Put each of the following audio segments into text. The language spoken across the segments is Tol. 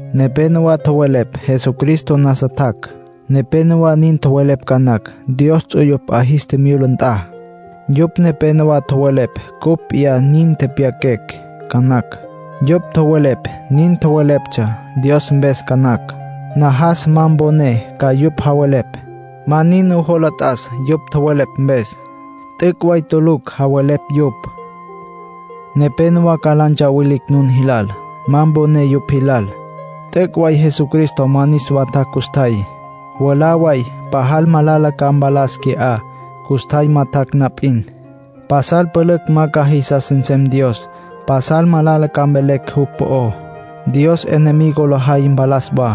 Nepénowa tjowelepj Jesucristo nasa tjac'. Nepénowa nin tjowelepj ca nacj Dios ts'uyupj 'a jis tjimyula nt'a. Yupj nepénowa tjowelepj cupj p'iyá nin tepyaquecj ca nacj. Yupj tjowelepj nin tjoweleptsja Dios mpes ca nacj. Najas ma mponé ca yupj javelepj. Ma nin nujola t'as yupj tjowelepj mpes. T'üc' way tulucj javelepj yupj. Nepénowa ca la ntsawilicj nun jilal. Ma mponé yupj jilal. T'üc' way Jesucristo ma niswa tjac' custjay. Mwalá way pajal malala ca mpalas qui'á, custjay ma tjac' na p'in. Pasal pülücj ma ca jisas nsem Dios. Pasal malala ca mvelecj jupj po'ó. Dios enemigo lay mpalas wa.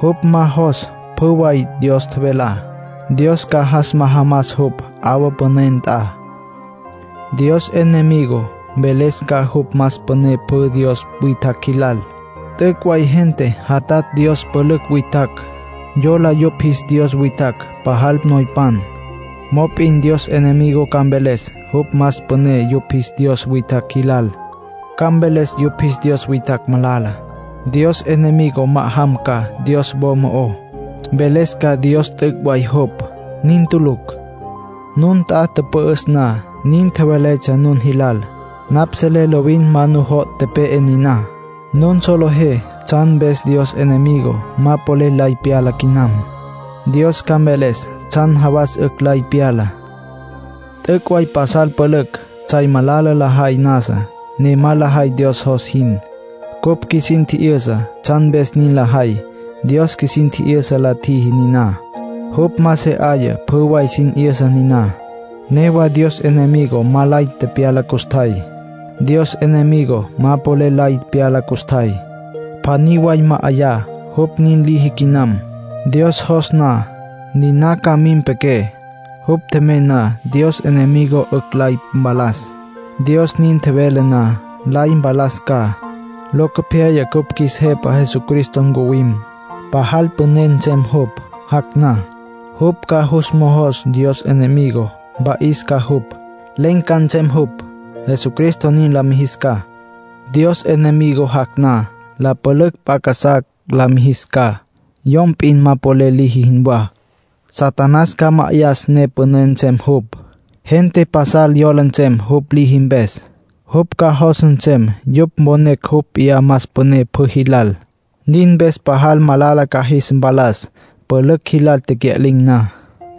Jupj ma jos pjü way Dios tjevelá. Dios ca jas majamas jupj 'awa püné nt'a. Dios enemigo mveles ca jupj más püné pjü dios witjacj jilal. T'üc' way gente jatatj dios pülücj witjacj, yola yupj jis dios witjacj pajal noypan. Mop'in Dios enemigo ca mveles jupj más püné yupj jis dios witjacj jilal. Ca mveles yupj jis dios witjacj malala. Dios enemigo ma'ajam ca Dios wo mo'ó. Mveles ca Dios t'üc' way jupj. Nin tulucj. Nun nt'a tüpü'üs na, niná tjeveletsja nun jilal. Napj selé lovin ma nujo' tepe'e niná. Nun solejé tsjan mpes Dios enemigo ma polel lay pyala quinam. Dios ca mveles tsjan jawas 'ücj lay pyala. T'üc' way pasal pülücj tsjay malala lajay nasa, ne ma lajay Dios jos jin. Cupj qjuisin tji'yüsa tsjan mpes nin lajay. Dios qjuisin tji'yüsa la tjiji niná; jupj ma se 'aya pjü way sin 'yüsa niná. Newa Dios enemigo ma lay tepyala custjay. Dios enemigo ma polel lay pyala custjay; pjaní way ma 'yaya jupj nin liji quinam. Dios jos na, niná ca mim quepé. Jupj tjemey na, Dios enemigo 'ücj lay mpalas. Dios nin tjevele na, lay mpalas ca. Locopyaya cupj qjuis Jepa Jesucristo ncuwim. Pajal püné nsem jupj, jac' na. Jupj ca jus mojos Dios enemigo, mpa'is ca jupj. Len̈ ca nsem jupj, Jesucristo nin la mijis ca. Dios enemigo jac' na, la pülücj p'a casá la mijis ca, yom p'in ma polel liji jinwá. Satanás ca ma'ayas ne püné nsem jupj. Gente pasal yola nsem jupj liji mpes. Jupj ca jos nsem yupj mponecj jupj p'iyá más püné pjü jilal. Nin mpes pajal malala ca jis mpalas pülücj jilal tecya'lin̈ na.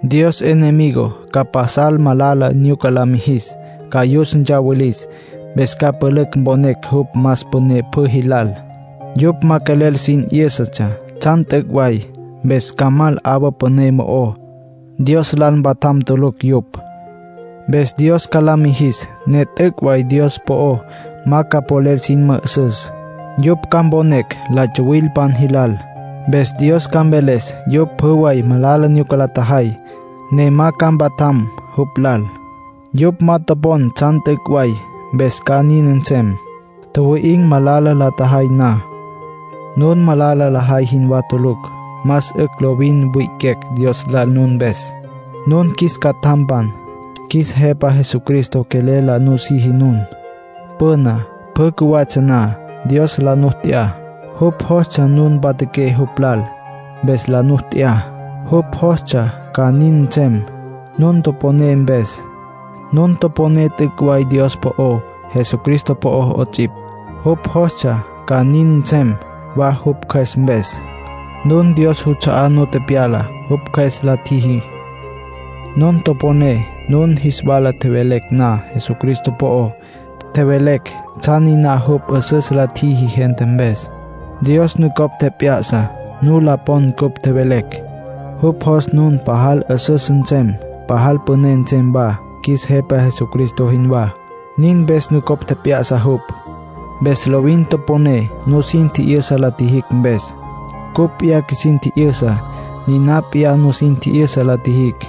Dios enemigo ca pasal malala nyuca la mijis, ca yus ntsawilis, mpes ca pülücj mponecj jupj más püné pjü jilal. Yupj ma quelel sin 'yǘsatsja tsjan t'üc' way, mpes ca mal 'awa püné mo'ó; Dios lal mpatjam tulucj yupj. Mpes Dios ca la mijis ne t'üc' way Dios po'o ma ca polel sin mü'üsüs. Yupj ca mponecj la tsuwilpan jilal. Mpes Dios ca mveles yupj pjü way malala nyuca la tjajay, ne ma ca mpatjam jupj lal. Yupj ma topon tsjan t'üc' way, mpes ca nin nsem. Tjuwi'in̈ malala la tjajay na. Nun malala lajay jinwá tulucj. Más 'ücj lovin wi'iquecj Dios lal nun mpes. Nun qjuis catjampan. Qjuis Jepa Jesucristo quelel la nusiji nun. Püna, pjü cjuwatsja na, Dios la nu t'ya. Jupj jostsja nun mpatjaqué jupj lal, mpes la nu t'ya. Jupj jostsja ca nin nsem nun toponé mpes. Nun toponé t'üc' way Dios po'ó, Jesucristo po'ó 'ots'ipj. Jupj jostsja ca nin nsem wa jupj Cjües mpes. Nun Dios juts'a'á nu tepyala, jupj Cjües la tjiji. Nun toponé nun jis wala tjevelecj na Jesucristo po'ó. Tjevelecj tsjan niná jupj 'üsüs la tjiji gente mpes. Dios nucopj tjep'ya'sa nu la pon cupj tjevelecj. Jupj jos nun pajal 'üsüs nsem, pajal püné nsem wa, qjuis Jepa Jesucristo jinwá. Nin mpes nucopj tjep'ya'sa jupj. Mpes lovin toponé nusin tji'yüsa la tjijicj mpes. Cupj p'iyá qjuisin tji'yüsa, niná p'iyá nusin tji'yüsa la tjijicj.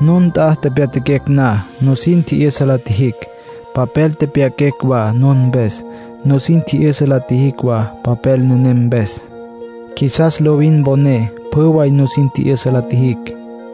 Nun nt'a tepyatjaquecj na, nusin tji'yüsa la tjijicj. Papel tepyaquecj wa nun mpes, nusin tji'yüsa la tjijicj wa papel nenem mpes. Qjuisas lovin mponé pjü way nusin tji'yüsa la tjijicj.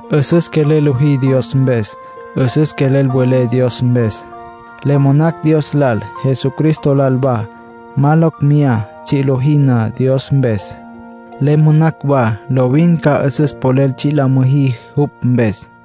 'Üsüs quelel lojí Dios mpes. 'Üsüs quelel welé Dios mpes. Le monacj Dios lal, Jesucristo lal wa, ma ca locj meyá tsji' lojí na Dios mpes. Le monacj wa lovin ca 'üsüs polel tsji' la müjí jupj mpes.